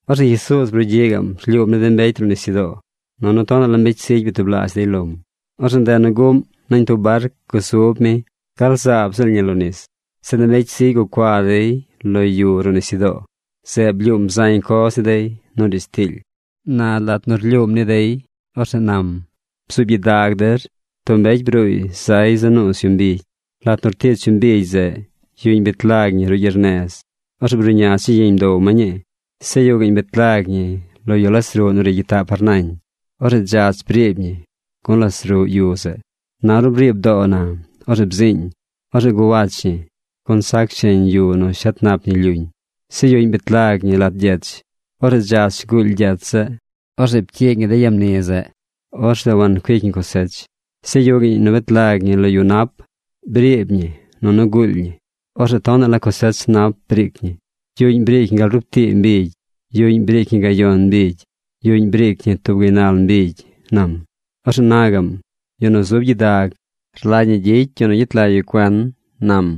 Orzeꞌ Jesuuz brugyiꞌ gaꞌm rlyuum ni de mbecy ruꞌ nisyudoo, nunu tonaꞌ la mbecy zigy byatublaazh dey lom. Orzeꞌ ndeꞌ nu guꞌm, nañ tub barc gusub mi gal zaab ziꞌl ñi lo nis. Zeꞌ de mbecy zigy gucua dey lo yu ruꞌ nisyudoo. Zeꞌ blyuum zañ coz ni dey nu riidz tiily. Na lat nu rlyuum ni dey, orzeꞌ nam: ―Bzuub gyidag der: Tub mbecy bruuy zay za nuuz yu mbigy. Lat nu rtich yu mbigy zeꞌ, yuꞌñ bet lag ñi ruꞌ gyernez. Orzeꞌ bruꞌña chigyiñ bdow ma ñii. Zeꞌ yuꞌ gaꞌñ bet lag ñi lo yu las ruꞌ nu ri gyitaꞌ par nañ. Orzeꞌ dzach briib ñi gun las ruꞌ yu zeꞌ. Na ornu briib doo na, orzeꞌ bziiñ. Orzeꞌ guwach ñi gun sac sheñ yu nu shet nap ñi lyuñ. Zeꞌ yuꞌñ bet lag ñi lat gyech. Orzeꞌ dzach guuly gyech zeꞌ. Orzeꞌ pcyiig ñi de yamni zeꞌ. Orzeꞌ wancuic ñi cosech. Zeꞌ yuꞌ gaꞌñ nu bet lag ñi lo yu nap. Briib ñi nunu guuly ñi. Orzeꞌ tonaꞌ la cosech nap briic ñi. Yuꞌñ briic ñi gal rub tii mbigy. Yuꞌñ briic ñi gayon mbigy. Yuꞌñ briic ñi tub gaynal mbigy ―nam. Orzeꞌ na gaꞌm: ―Yu nu zub gyidag rlagy ñi gyicy yu nu gyet lag yu cuen ―nam.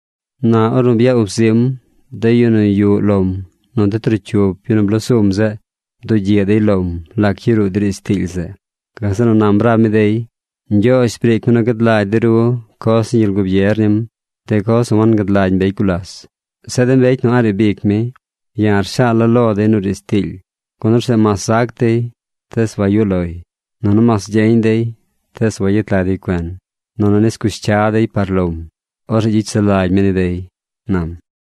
Na ornu bya ub zim, de yu nu yuꞌ lom nu de trocyup yu nu bloo sum zeꞌ bdugyiꞌ dey lom lac yaruu de riidz tiily zeꞌ. Gazeꞌ nu nam rab mi dey: ―Ñgyoozh briic mi nu gad lagy de ru coz ni gyel gubier nim, de coz nu wangad lagy mbecy gulas. Zeꞌ de mbecy nu a̱ꞌ riib ic mi, ya̱ rshaala̱ lo dey nu riidz tiily. Gun orzeꞌ mas zac dey, tees wayuꞌ loy, nunu mas gyeñ dey, tees wayet lag dey cuen, nunu nis cush cya dey par lom. Orzeꞌ gyicy sulagy mi ni dey ―nam.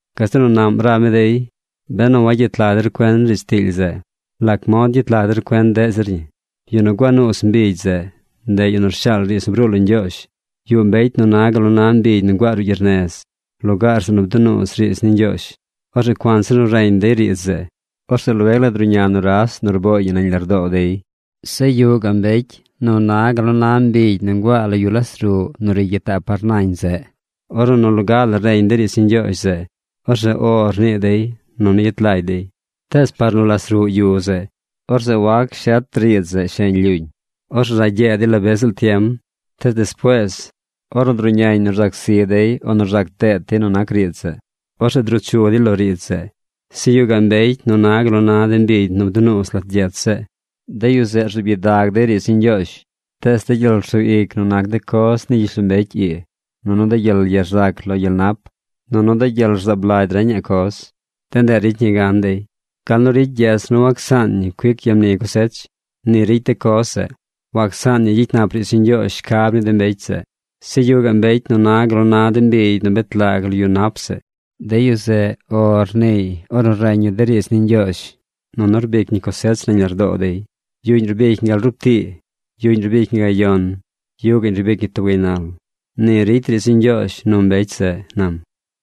Gazeꞌ nu naꞌm rab mi dey: ―Benu wagyet lag der cuen riidz tiily zeꞌ, ¿lac mod gyet lag der cuen deꞌ zir ñi? Yu nu gua nuuz mbigy zeꞌ, ndeꞌ yu nu rshaal riidz nu bruu lo Ñgyoozh. Yuꞌ mbecy nu na gal nu na mbigy nu nguaa ruꞌ gyernez, lugaar zeꞌ nu bdunuuz riidz ni Ñgyoozh. Orzeꞌ cuanzir nu reñ dey riidz zeꞌ, orzeꞌ lueg la druꞌña nuras nu rbooy ñi nañ lardoo dey. Zeꞌ yuꞌ gaꞌ mbecy nu na gal nu na mbigy nu nguaa lo yu las ruꞌ nu ri gyitaꞌ par nañ zeꞌ. Ornu nu loga la reñ dey riidz ni Ñgyoozh zeꞌ, orzeꞌ “O” rnii dey, nunu yet lagy dey. Tees par nu las ruꞌ yu zeꞌ, orzeꞌ wac shet riidz zeꞌ sheñ lyuñ. Orzeꞌ ragyee dey la be ziꞌl tiem. Tees despuees, ornu druꞌñañ nu rzac zi dey o nu rzac deet dey nu nac riidz zeꞌ, orzeꞌ druu chu dey lo riidz zeꞌ. Zeꞌ yuꞌ gaꞌ mbecy nu na gal na de mbigy nu bdunuuz lat gyech zeꞌ. De yu zeꞌ rzuub gyidag dey riidz ni Ñgyoozh. Tees de gyel rsug ic nu nac de coz ni gyishlombecy ii, nunu de gyel ye rzac lo gyel nap, nunu de gyel rzaab lagy reñaꞌ coz, de ndeꞌ ricy ñi gan dey. Gal nu ricy gyech nu wacsaan ñi cuic yamni cosech, ni ricy de coz zeꞌ. Wacsaan ñi gyicy nap riidz ni Ñgyoozh shcab ni de mbecy zeꞌ. Zeꞌ yuꞌ gaꞌ mbecy nu na gal nu na de mbigy nu bet lag lo yu nap zeꞌ. De yu zeꞌ “O” rniiy ornu reñ yu de riidz ni Ñgyoozh, nunu rbic ñi cosech nañ lardoo dey. Yuꞌñ rbic ñi gal rub tii. Yuꞌñ rbic ñi gayon. Yuꞌ gaꞌñ rbic ñi tub gaynal. Ni ricy riidz ni Ñgyoozh nu mbecy zeꞌ ―nam.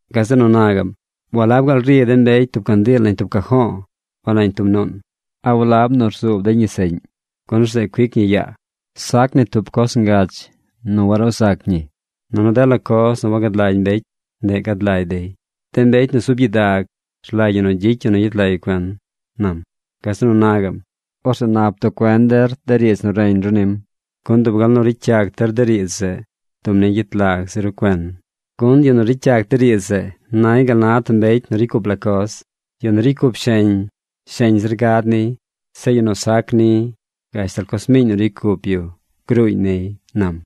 Gazeꞌ nu na gaꞌm: ―¿Walab gaal ri de mbecy tub candiil nañ tub cajo̱o̱ o nañ tub nuun? ¿A walab nu rzuub dey ñi seꞌñ? Gun orzeꞌ cuic ñi yaa. Sac ni tub coz ngach nu waruu zac ñi. Nunu dela coz nu wagad lagy mbecy, ndeꞌ gad lagy dey. De mbecy nu zub gyidag rlagy ñi gyicy yu nu gyet lag yu cuen ―nam. Gazeꞌ nu na gaꞌm: ―Orzeꞌ nap bduꞌ cuen der de riidz nu reñ ru nim, gun dub gal nu ricy yac der de riidz zeꞌ, dub ñi gyet lag zir ru cuen. Gun yu nu ricy yac de riidz zeꞌ nay gal na tub mbecy nu ricy cup la coz. Yu nu ricy cup sheñ, sheñ zir gad niy. Zeꞌ yu nu sac ni, gashtal coz miiñ nu ricy cup yu gruuñ niy ―nam.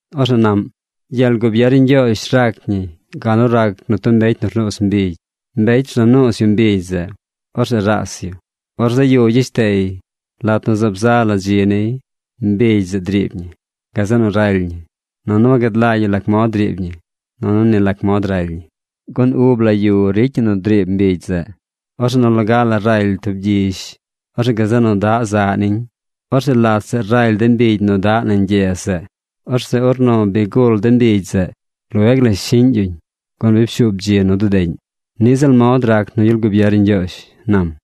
Orzeꞌ naꞌm: ―Gyel gubier ni Ñgyoozh rac ñi gal nu rac nu tub mbecy nu rnuuz mbigy. Mbecy rza nuuz yu mbigy zeꞌ. Orzeꞌ raas yu. Or zaꞌ yu yeshtey. Lat nu zaab za la dzi niy, mbigy zeꞌ driib ñi. Gazeꞌ nu raly ñi. Nunu wagad lagy yu lac mod driib ñi nunu ni lac mod raly ñi. Gun ub la yu ricy ñi nu driib mbigy zeꞌ. Orzeꞌ nu loga la raly tub gyizh. Orzeꞌ gazeꞌ nu daꞌ zaꞌ niñ. Orzeꞌ lat zeꞌ raly de mbigy nu daꞌ nañ gyez zeꞌ. Orzeꞌ ornu bi gul de mbigy zeꞌ, lueg la shiꞌñ yuñ gun bi pshuub dzi nu dudeꞌñ. Niꞌ ziꞌl mod rac nu gyel gubier ni Ñgyoozh ―nam.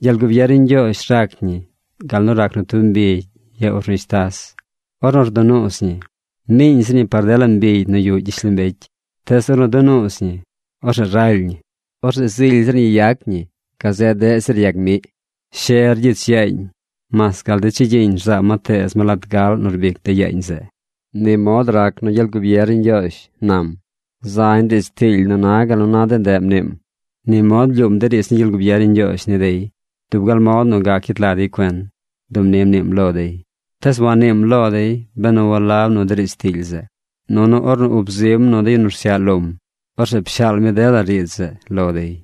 Gyel gubier ni Ñgyoozh rac ñi gal nu rac nu tub mbigy ya urnishtas. Ornu rdunuuz ñi, miiñ zir ñi par dela mbigy nu yuꞌ gyishlombecy. Tees ornu dunuuz ñi, orzeꞌ raly ñi. Orzeꞌ zily zir ñi yac ñi gazeꞌ deꞌ zir yag miꞌ. She rgyich yaañ mas gal de chigyiñ rzaa ma teez ma lat gaꞌl nu rbic de yaañ zeꞌ. Ni mod rac nu gyel gubier ni Ñgyoozh ―nam. Zañ riidz tiily nu na gal nu na de ndeꞌ mniim. Ni mod blyuum de riidz ni gyel gubier ni Ñgyoozh ni dey. Dub gal mod nu gac gyet lag dey cuen, dub ni mniim lo dey. Tees wanniim lo dey benu walab nu de riidz tiily zeꞌ. Nunu ornu ub zim nu de yu nu rsyaꞌ lom, orzeꞌ pshaal mi dela riidz zeꞌ lo dey.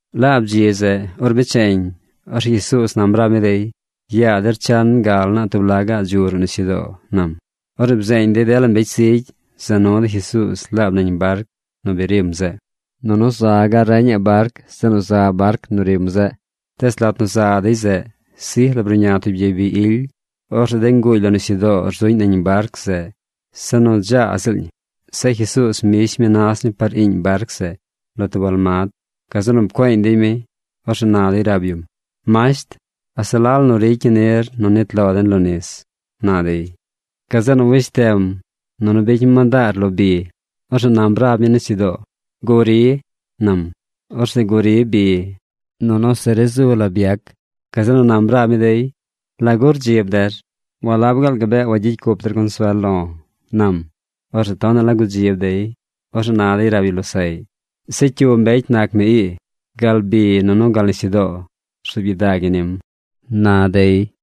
Laab dzi zeꞌ, or becheñ, orzeꞌ Jesuuz nam rab mi dey: ―Yaa der chan gal naa tub laꞌ gaꞌ dzu ruꞌ nisyudoo ―nam. Orzeꞌ bzeeñ dey dela mbecy zigy, za nu dey Jesuuz laab nañ barc nu bi rim zeꞌ. Nunu za gaꞌ reñaꞌ barc zeꞌ nu za barc nu rim zeꞌ. Tees lat nu za dey zeꞌ, sij la bruꞌña tub gyey bi ily. Orzeꞌ de nguuly lo nisyudoo rzuꞌñ nañ barc zeꞌ se nu dzaa ziꞌl ñi. Zeꞌ Jesuuz mbish mi nas mi par iiñ barc zeꞌ lo tub almad. Gazeꞌ nu pcueeñ dey mi. Orzeꞌ na dey rab yum: ―¡Masht! ¿A se la la nu ricy ñi nir nu nit lo den lo nis? ―na dey. Gazeꞌ nu weshtem nunu bicy mi mandaar lo bi. Orzeꞌ nam rab mi nisyudoo: ―¡Guri! ―nam. Orzeꞌ guri bi nunu se ri zu la byac. Gazeꞌ nu nam rab mi dey: ―¿Lagu dzi rdzib der? ¿Walab gaal gabee wagyicy cup der consuel lo̱? ―nam. Orzeꞌ tonaꞌ la gudzib dey. Orzeꞌ na dey rab yu losaꞌy: ―Zeꞌ ¿cyu mbecy nac mi ii? Gal bi nunu gal nisyudoo rzuub gyidag ñi nim ―na dey.